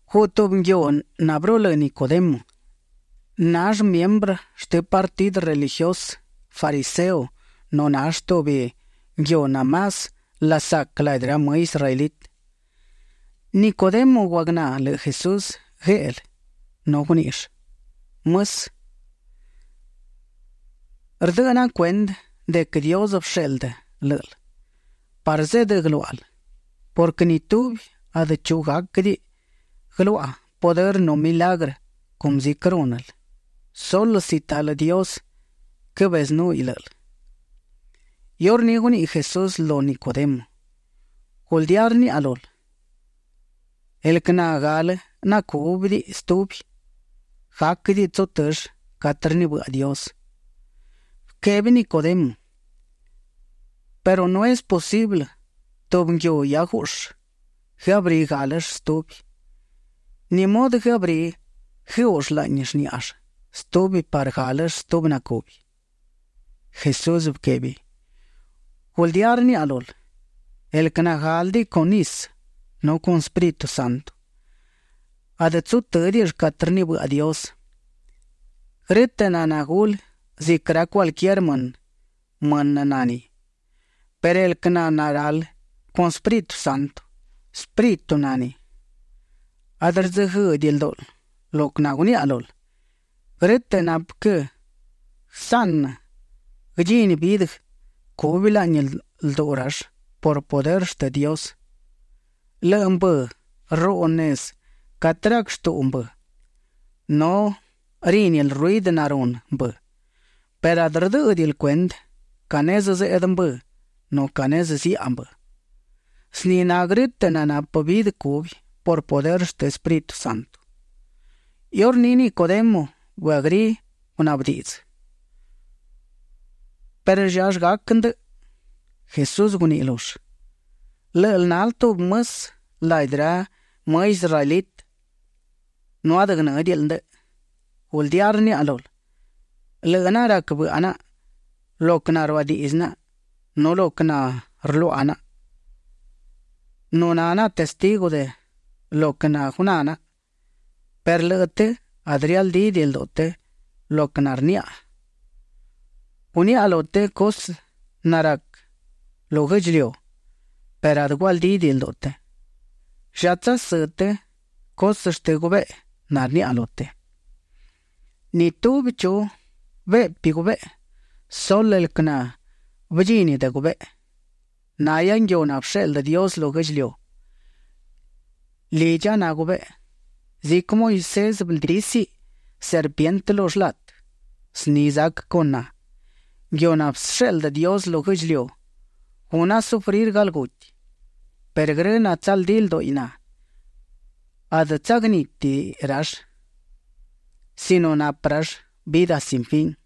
Guꞌ tubi nguiu nabërulë́ Nicodemo. Nall miembrë shtë partidë religiusë fariseo nu nall tubi nguiu namás lasac ladi ra më israelitë. Nicodemo guagná lëꞌë Jesús gueꞌlë nu guníꞌill: ―Mësë. Rdëꞌë naꞌa cuendë de quë Dios bësheꞌldë lë́ꞌël parë zeꞌdë guëluáꞌal, purquë ni tubi adë chu gáquëdiꞌi guëluaꞌa pudërë nu milagrë cumë ziquë rúnël, sulë si talë Dios quëbezënúhiꞌ lë́ꞌël. Iurní guniꞌi Jesús lu Nicodemo: ―Guldía rniaꞌa lul, el quë nagalë nacúbidiꞌi stubi, gáquëdiꞌi tsutëll catë rnibëꞌa Dios. Bëquebi Nicodemo: ―Perë no es posiblë tubi nguiu hia guꞌshë, guëabrí gálëll stubi. ¿Ni mudë guëabrí guëuꞌll laꞌni shníꞌall stubi parë galë stubi nacubi? Jesús bëquebi: ―Guldía rniaꞌa lul, el quë nagálëdiꞌi con nisë nu con Espíritu Santo, adë tsutë́diꞌill catë rnibëꞌa Dios. Grë́tëꞌ naná gulë ziquë ra cualquier mënë, mënë na ni, perë el quë naralë con Espíritu Santo, espíritu na ni. Adë rdzëguëëꞌdiꞌi ldúꞌul lo quë naguniaꞌa lul, grë́tëꞌ napë quë guësaꞌnë guëdchini vidë cubi laꞌni lduꞌu rall por pudërë shtë Dios. Lëꞌë mbë rruꞌu nezë catë rac shtuꞌu mbë, nu rínil ruidë narunë mbë perë adë rdë́ꞌëdiꞌil cuendë ca nezë zeꞌdë mbë nu ca nezë ziaꞌa mbë. Zni na grë́tëꞌ nanapë vidë cubi por pudërë shtë Espíritu Santo. Iurní Nicodemo bëabrí gunaꞌbë diꞌdzë: ―¿Perë llallë gac ndëꞌë? Jesús guniꞌi lull: ―Lë́ꞌël nal tubi mësë ladi ra më israelitë nu adë guënë́diꞌil ndëꞌë. Guldía rniaꞌa lul, lëꞌë naꞌa rac bëꞌa naꞌa lo quë naruadiꞌdzë naꞌa nu lo quë narluaꞌa naꞌa; nu na naꞌa testigu de lo quë guná naꞌa, perë lëꞌë të adë rialdídiꞌi lduꞌu të lo quë narniꞌi naꞌa. Guniaꞌa lu të cusë narac lu guë́ꞌdchiliu perë adë gualdídiꞌi lduꞌu të. ¿Lla tsasë́ të cusë shtë gubeꞌe narniaꞌa lu të? ’Ni tubi chu beꞌpi gubeꞌe, sulë el quë nabëdchini de gubeꞌe. Nahia nguiu nabësheꞌldë Dios lu guë́ꞌdchiliu; lidcha na gubeꞌe. Ziquë Moisés bëldísiꞌ serpientë lu shlatë, zni zac con na, nguiu nabësheꞌldë Dios lu guë́ꞌdchiliu; guna sufrir galguti; parë grë natsaldí lduꞌi na, adë tsagnítidiꞌi rall sino napë rall vidë sin fin.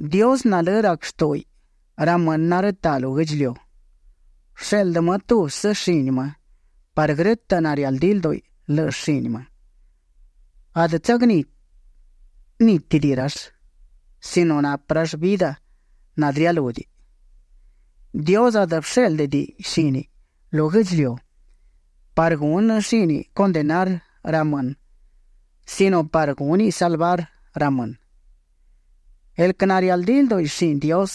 ’Dios nalë́ rac shtúꞌuiꞌ ra mënë narëtaꞌ lu guë́ꞌdchiliu; bësheꞌldë më tubsë shini më parë grë́tëꞌ narialdí lduꞌi lëꞌë shini më, adë tsagnítidiꞌi rall sino napë rall vidë nadë rialúdiꞌi. Dios adë bëshéꞌldëdiꞌi shíniꞌ lu guë́ꞌdchiliu parë gunë shíniꞌ condenar ra mënë sino parë gúniꞌ salvar ra mënë. ’El quë narialdí lduꞌi shini Dios,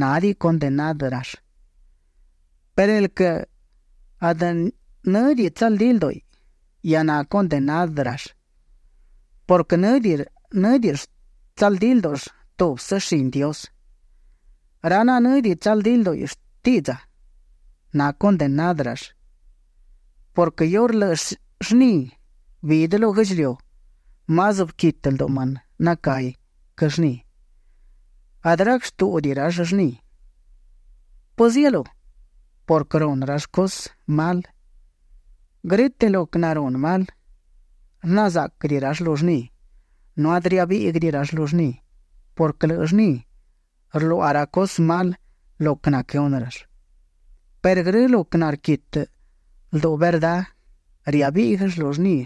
nádiꞌi condenárëll, perë el quë adë në́diꞌi tsaldí lduꞌu, hia nacondenárëll purquë në́diꞌill tsaldí ldúꞌull tubsë shini Dios. Ra nanë́diꞌi tsaldí lduꞌi shtiꞌdza, nacondenárëll purquë iurë lëꞌë llni bidë lu guë́ꞌdchiliu, más bëquitë lduꞌu mënë nacahi quë llni. Adë rac shtúꞌudiꞌi rall llni. ¿Pëzielú? purquë runë rall cusë mal. Grë́tëꞌ lo quë narunë mal, rna záꞌquëdiꞌi rall lu llni nu adë riabíꞌguëdiꞌi rall lu llni purquë lëꞌë llni rluaꞌa ra cusë mal lo quë naquëhunë rall; perë grë lo quë narquitë lduꞌu verdá, riabíꞌguëll lu llni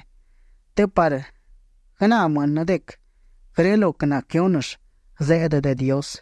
të parë guëná mënë de quë grë lo quë naquëhúnëll, zeꞌdë de Dios.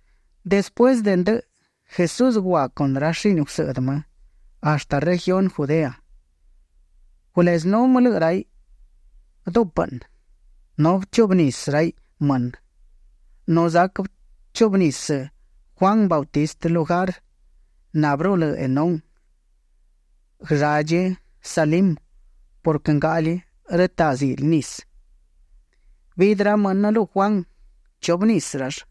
Despuësë de ndëꞌë, Jesús gua con ra shini gusëꞌdë më hashtë regiuni Judea. Gulezënú më lëꞌë raiꞌ dupëꞌnë, nu bëchuꞌbë nisë raiꞌ mënë. Nu zac bëchuꞌbë nisë Juan Bautista lugar nabërulë́ Enón guëlladchi Salim purquë ngaꞌli rëtaꞌ zili nisë. Bidë ra mënë lu Juan, chubë nisë rall.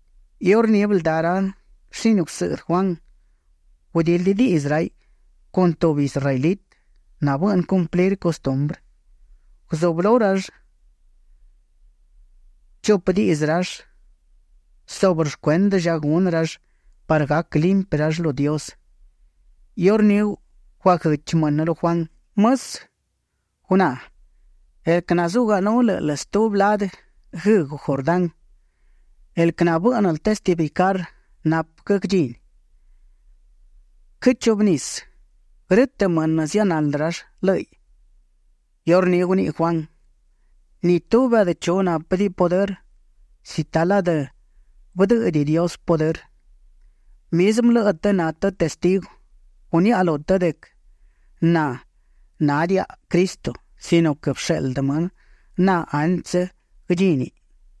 Iurní bëldá shini gusëꞌdë Juan, gudildi diꞌdzë raiꞌ con tubi israelitë nabëꞌnë cumplir custumbrë. Guzublú rall chupë diꞌdzë subrë shcuendë lla gunë rall parë gac limpi rall lu Dios. Iurní guaguëchi mënë lu Juan: ―Mësë, guná; el quë naguzunú lë́ꞌël stubi ladë guëëꞌgu Jordán, el quë bë́ꞌnël testificar napë quë guëdchíniꞌ, quëgchuꞌbë nísiꞌ. Grë́tëꞌ mënë zianaldë rall lë́ꞌiꞌ. Iurní guniꞌi Juan: ―Ni tubi adë chu nápëdiꞌi pudërë si talë adë bëdë́ꞌëdiꞌi Dios pudërë. Mizmë lëꞌë të na të testigu, guniaꞌa lu të de quë na nádiaꞌa Cristo sino quë bësheꞌldë më na antsë guëdchíniꞌ.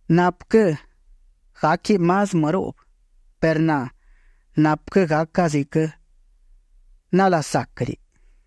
Napë quë gáquiꞌ más më ruꞌbë, perë na napë quë gaca ziquë nalasáquëdiꞌi.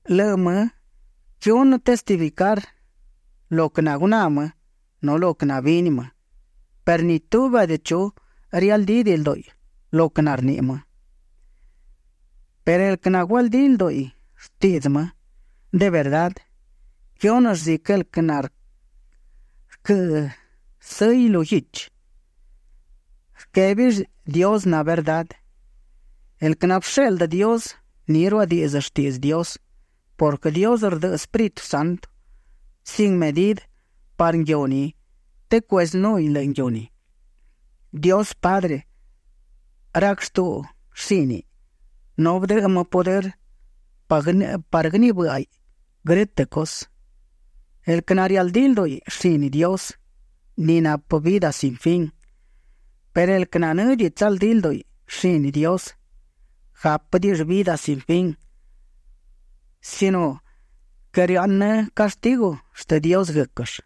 Lëꞌë më quëhunë testificar lo quë naguná më nu lo quë nabini më, perë ni tubi adë chu rialdídiꞌi lduꞌi lo quë narniꞌi më. Perë el quë nagualdí lduꞌu shtiꞌdzë më de verdá, quëhúnëll ziquë el quë narquë́ sëgi lu guichi; rquébill Dios na verdá. El quë nabësheꞌldë Dios, ni ruadíꞌdzëll shtiꞌdzë Dios purquë Dios rdëꞌë Espíritu Santo sin medidë parë nguiu ni të cuezënúhiꞌ lëꞌë nguiu ni. Dios Padre rac shtuꞌu shíniꞌ nu bëdëꞌë më pudërë parë guënibë́ꞌaiꞌ grë́tëꞌ cusë. El quë narialdí lduꞌu shini Dios, ni napë vidë sin fin, perë el quë nanë́diꞌi tsaldí lduꞌi shini Dios, gápëdiꞌill vidë sin fin sino quë rëaꞌnë cashtigu shtë Dios guë́quëll.